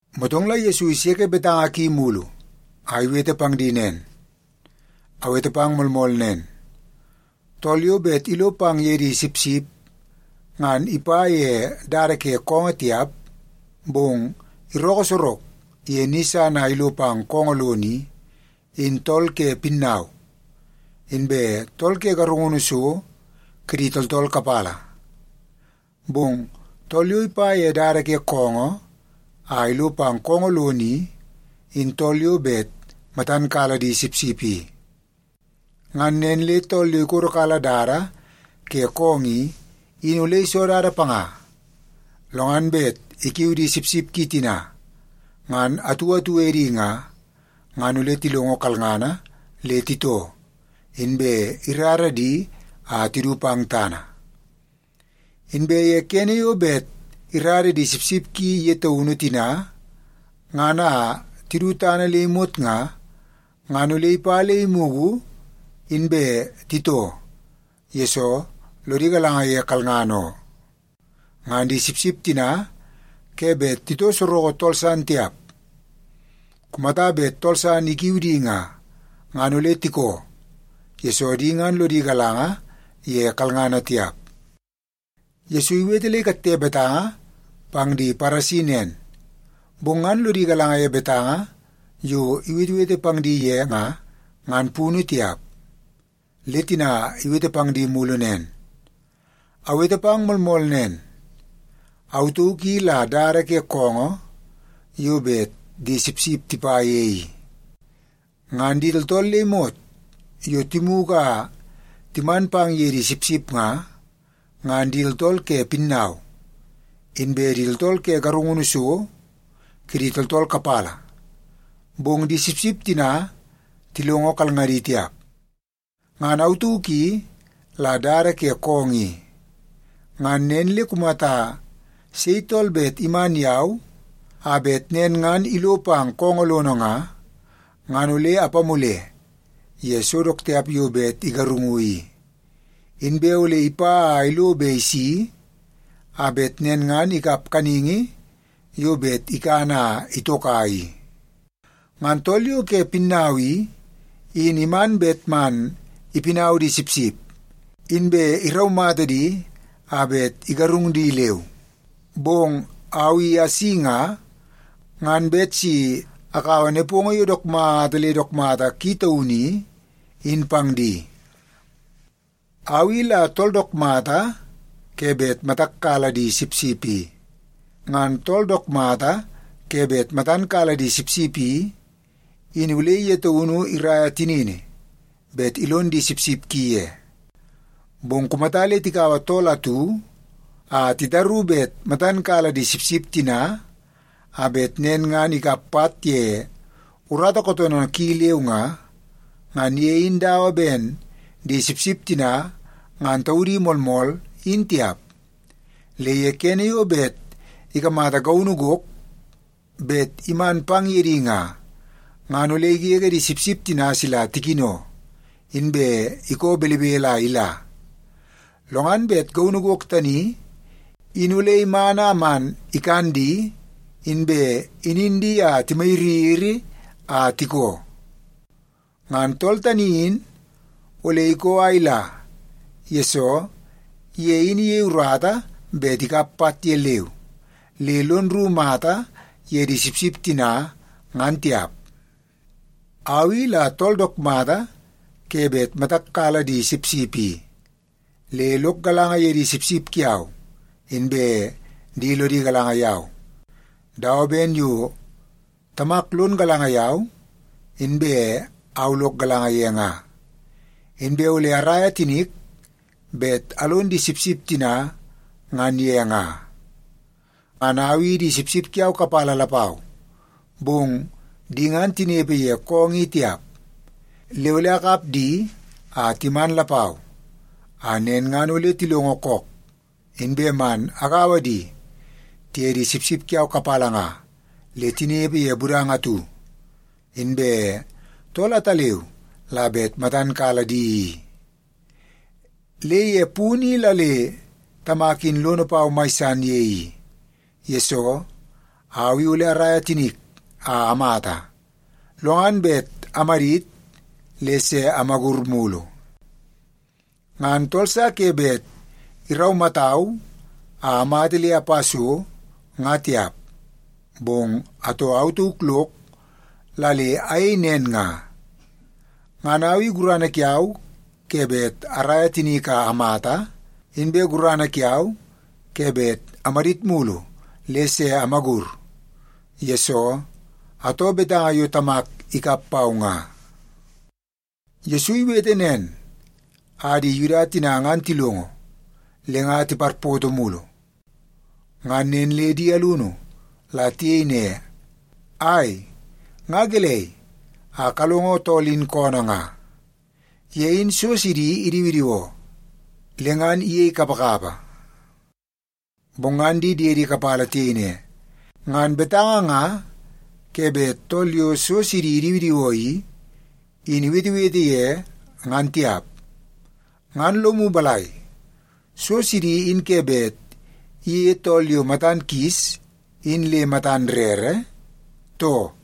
Motong la Yesu iseke betanga ki mulu a iwete pang di nen, “Awete pang moolmool nen, tool yo bet ilo pang ye di sipsip, ngan ipa ye dada ke koongoo tiap, bong irookoo sorok ye ni san a ilo pang koongoo lono i, in tool ke pinnau inbe tool ke garungunu so kidi tooltool kapala. Bong tool yo ipa ye dada ke koongoo a ilo pang koongoo lono i, in tool yo bet matan kala di sipsip i. Ngan nen le tool yo ikodokala dada ke koongoo i, in ole iso dada panga. Lo ngan bet ikiu di sipsip ki tina ngan atu atu edi nga, ngan ole tilongo kalngana le titoo, inbe irara di a tidu pang tana. Inbe ye kene yo bet irara di sipsip ki ye taunu tina ngan a tidu tana le imot nga, ngan ole ipa le imugu, inbe titoo, yesoo lodi galanga ye kalngana oo. Ngan di sipsip tina ke bet titoo soroko tool san tiap. Kumata bet tool san ikiu di nga, ngan ole tikoo, yesoo di ngan lodi galanga ye kalngana tiap.” Yesu iwete le ikatte betanga pang di Paresi nen, bong ngan lodi galanga ye betanga yo iwetewete pang di ye nga, ngan punu tiap. Le tina iwete pang di mulu nen, “Awete pang moolmool nen. Au tauk i la dada ke koongoo yo bet di sipsip tipa ye i. Ngan di tooltool le imot yo timugu a timan pang ye di sipsip nga, ngan di tooltool ke pinnau, inbe di tooltool ke garungunu so kidi tooltool kapala, bong di sipsip tina tilongo kalngadi tiap. Ngan au tauk i la dada ke koongoo i. Ngan nen le kumata sei tool bet iman yau a bet nen ngan ilo pang koongoo lono nga, ngan ole apamule ye so dook tiap yo bet igarungu i. Inbe ole ipa a ilo be isi, a bet nen ngan ikap kaningi yo bet ikan a itoka i. Ngan tool yo ke pinnau i, in iman bet man ipinau di sipsip, inbe iraumata di a bet igarung di leu. Bong au i asi nga, ngan bet si akaua nepongo yo dook mata le dook mata ki taunu i, in pang di. “Au i la tool dook mata ke bet matak kala di sipsip i. Ngan tool dook mata ke bet matan kala di sipsip i, in ole ye taunu iraia tinini bet ilon di sipsip ki ye. Bong kumata le tikaua tool atu a titaru bet matan kala di sipsip tina, a bet nen ngan ikap pat ye urata kootoonoo ki leu nga, ngan ye in dawa ben di sipsip tina ngan taudi moolmool, in tiap. Le ye kene yo bet ikamata gaunu gok bet iman pang ye di nga, ngan ole igege di sipsip tina sila tikino, inbe ikoo belebele a ila. Lo ngan bet gaunu gok tani in ole iman a man ikan di, inbe inin di a timayiriyiri a tikoo. Ngan tool tani in ole ikoo a ila, yesoo ye in iyei urata bet ikap pat ye leu, le lon rru mata ye di sipsip tina, ngan tiap. “Au i la tool dook mata ke bet matak kala di sipsip i. Le lok galanga ye di sipsip kiau, inbe di lodi galanga yau, dawa ben yo Tamak lon galanga yau, inbe au lok galanga ye nga. Inbe ole araia tinik bet alon di sipsip tina ngan ye nga. Ngan au i di sipsip kiau kapala lapau, bong di ngan tinepe ye koongoo i tiap. Le ole akap di a timan lapau, a nen ngan ole tilongo kook, inbe man agaua di tiye di sipsip kiau kapala nga le tinepe ye budanga atu, inbe tool ataleu la bet matan kala di i. Le ye punu i la le Tamak in lono pau mai san ye i, yesoo au i ole araia tinik a amata, lo ngan bet amadit le se amagur mulu. Ngan tool sa ke bet iraumatau a amata le apa so, nga tiap, bong atoo au tauk lok la le ayei nen nga. Ngan au i gurana kiau ke bet araia tinik a amata, inbe gurana kiau ke bet amadit mulu le se amagur, yesoo atoo betanga yo Tamak ikap pau nga.” Yesu iwete nen a di Yuda tina ngan tilongo, le nga tiparpoto mulu. Ngan nen le di alunu la tiyei ne, “Ai, nga gelei a kalongo tool in koonoo nga? Ye in so sidi idiwidiwoo le ngan iyei kapakapa.” Bong ngan di diedi kapala tiyei ne, “Ngan betanga nga ke bet tool yo so sidi idiwidiwoo i, in iwetewete ye, ngan tiap. Ngan lomu balai, so sidi in ke bet iyeie tool yo matan kis in le matan rere, too?”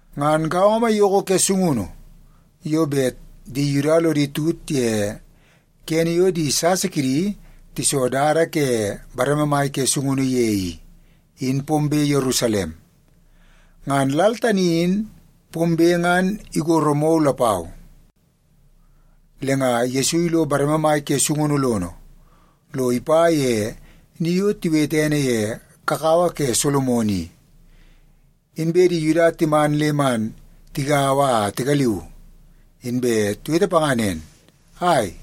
Ngan gaongo maiyoko ke sungunu yo bet di Yuda lodi tut ye kene yo di sasa kidi tiso dada ke bareme ke sungunu ye i, in pombe Yerusalem. Ngan lal tani in pombe ngan igoro mou lapau. Le nga Yesu ilo bareme mai ke sungunu lono, lo ipa ye ni yo tiwete ene ye Kakawa ke Solomon i. Inbe di Yuda timan le man tigaua a tigaliu, inbe tiwete panga nen, “Ai,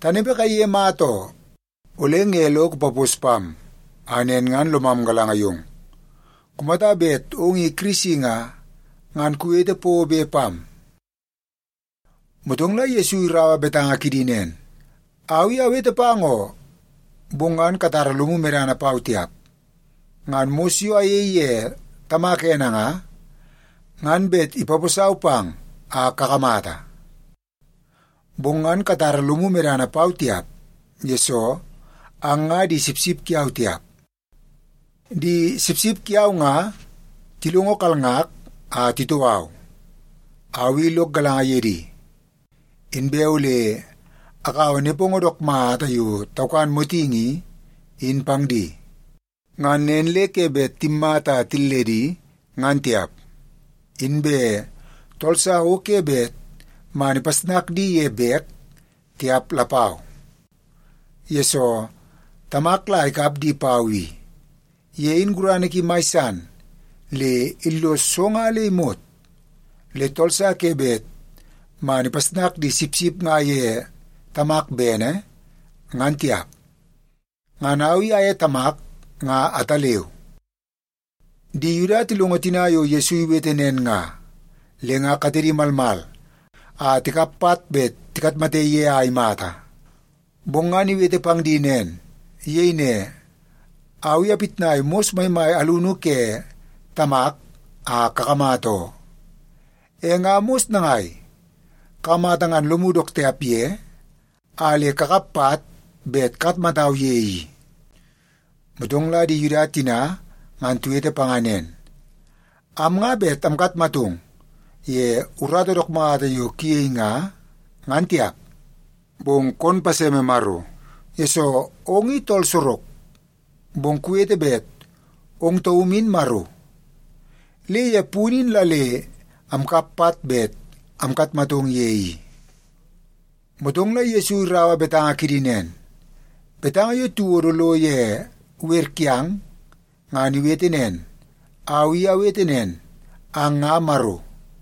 tanepe kaiye mata oo, ole nge lo kupapos pam a nen ngan lomam galanga yong? Kumata bet ong i Kirisi nga, ngan kuwete pobe pam.” Motong la Yesu iraua betanga kidi nen, “Au i awete pang oo, bong ngan katara lomu medana pau tiap. Ngan mos yo ayei ye Tamak ene nga, ngan bet ipaposau pang a kakamata. Bong ngan katara lomu medana pau tiap, yesoo ang nga di sipsip kiau tiap. Di sipsip kiau nga tilongo kalngak a titoo au. Au i lok galanga ye di, inbe ole akaua nepongo dook mata yo taukan motingi i, in pang di. Ngan nen le ke bet timmata a tilledi, ngan tiap. Inbe tool sa o ke bet man ipasnak di ye bek tiap lapau. Yesoo, Tamak la ikap di pau i. Ye in gurana ki mai san le illos so nga le imot, le tool sa ke bet man ipasnak di sipsip nga ye Tamak bene, ngan tiap. Ngan au i aye Tamak nga ataleu.” Di Yuda tilongo tina yo Yesu iwete nen nga, le nga katedi malmal a tikap pat bet tikatmate ye a imata, bong ngan iwete pang di nen. Iyei ne, “Au i apitnai mos maimai alunu ke Tamak a kakamata oo. E nga mos nangai kakamata ngan lomu dook tiap ye a le kakap pat bet kakatmatau ye i?” Motong la di Yuda tina ngan tiwete panga nen, “Am nga bet amkatmatong ye urata dook mata yo kuyei nga, ngan tiap. Bong kon paseme Maro, yesoo ong i tool sorok, bong kuwete bet ong taum in Maro. Le ye punu in la le amkap pat bet amkatmatong ye i.” Motong la Yesu iraua betanga kidi nen, “Betanga yo tiwodo lo ye wer kiang, ngan iwete nen, ‘Au i awete nen, ang nga maro.’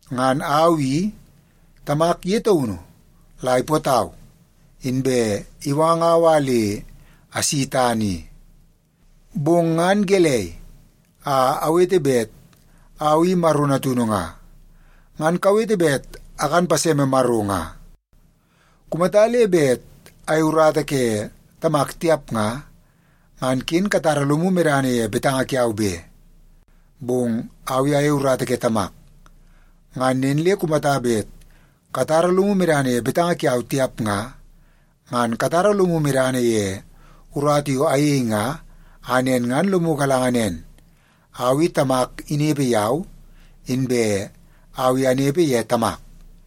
Ngan au i, Tamak ye taunu la ipootau, inbe iwangau a le asi tana i. Bong ngan gelei a awete bet Au i Maro Natunu nga, ngan kawete bet akan paseme Maro nga? Kumata le bet ayei urata ke Tamak tiap nga, ngan ken katara lomu medana ye betanga kiau be. Bong au i ayei urata ke Tamak. Ngan nen le kumata bet katara lomu medana ye betanga kiau tiap nga, ngan katara lomu medana ye urata yo ayei nga, a nen ngan lomu galanga nen, au i Tamak inepe yau, inbe au i anepe ye Tamak.”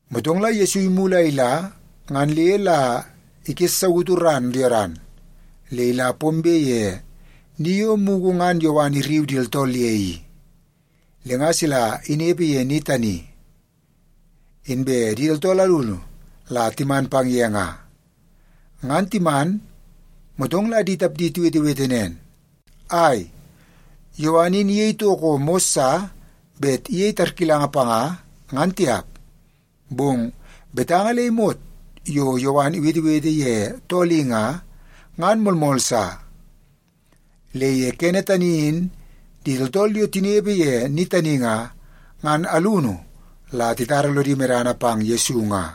Motong la Yesu imulu a ila ngan le la ikessautu ran Yodan le ila pombe ye ni yo mugu ngan Yowan irriu di tooltool ye i. Le nga sila inepe ye ni tani, inbe di tooltool alunu la timan pang ye nga. Ngan timan, motong la di tapdi tiwetewete nen, “Ai, Yowan in iyei toko mos sa bet iyei tarkilanga panga, ngan tiap, bong betanga le imot yo Yowan iwetewete ye tool i nga, ngan moolmool sa.” Le ye kene tani in di tooltool yo tinepe ye ni tani nga, ngan alunu la titara lodi medana pang Yesu nga.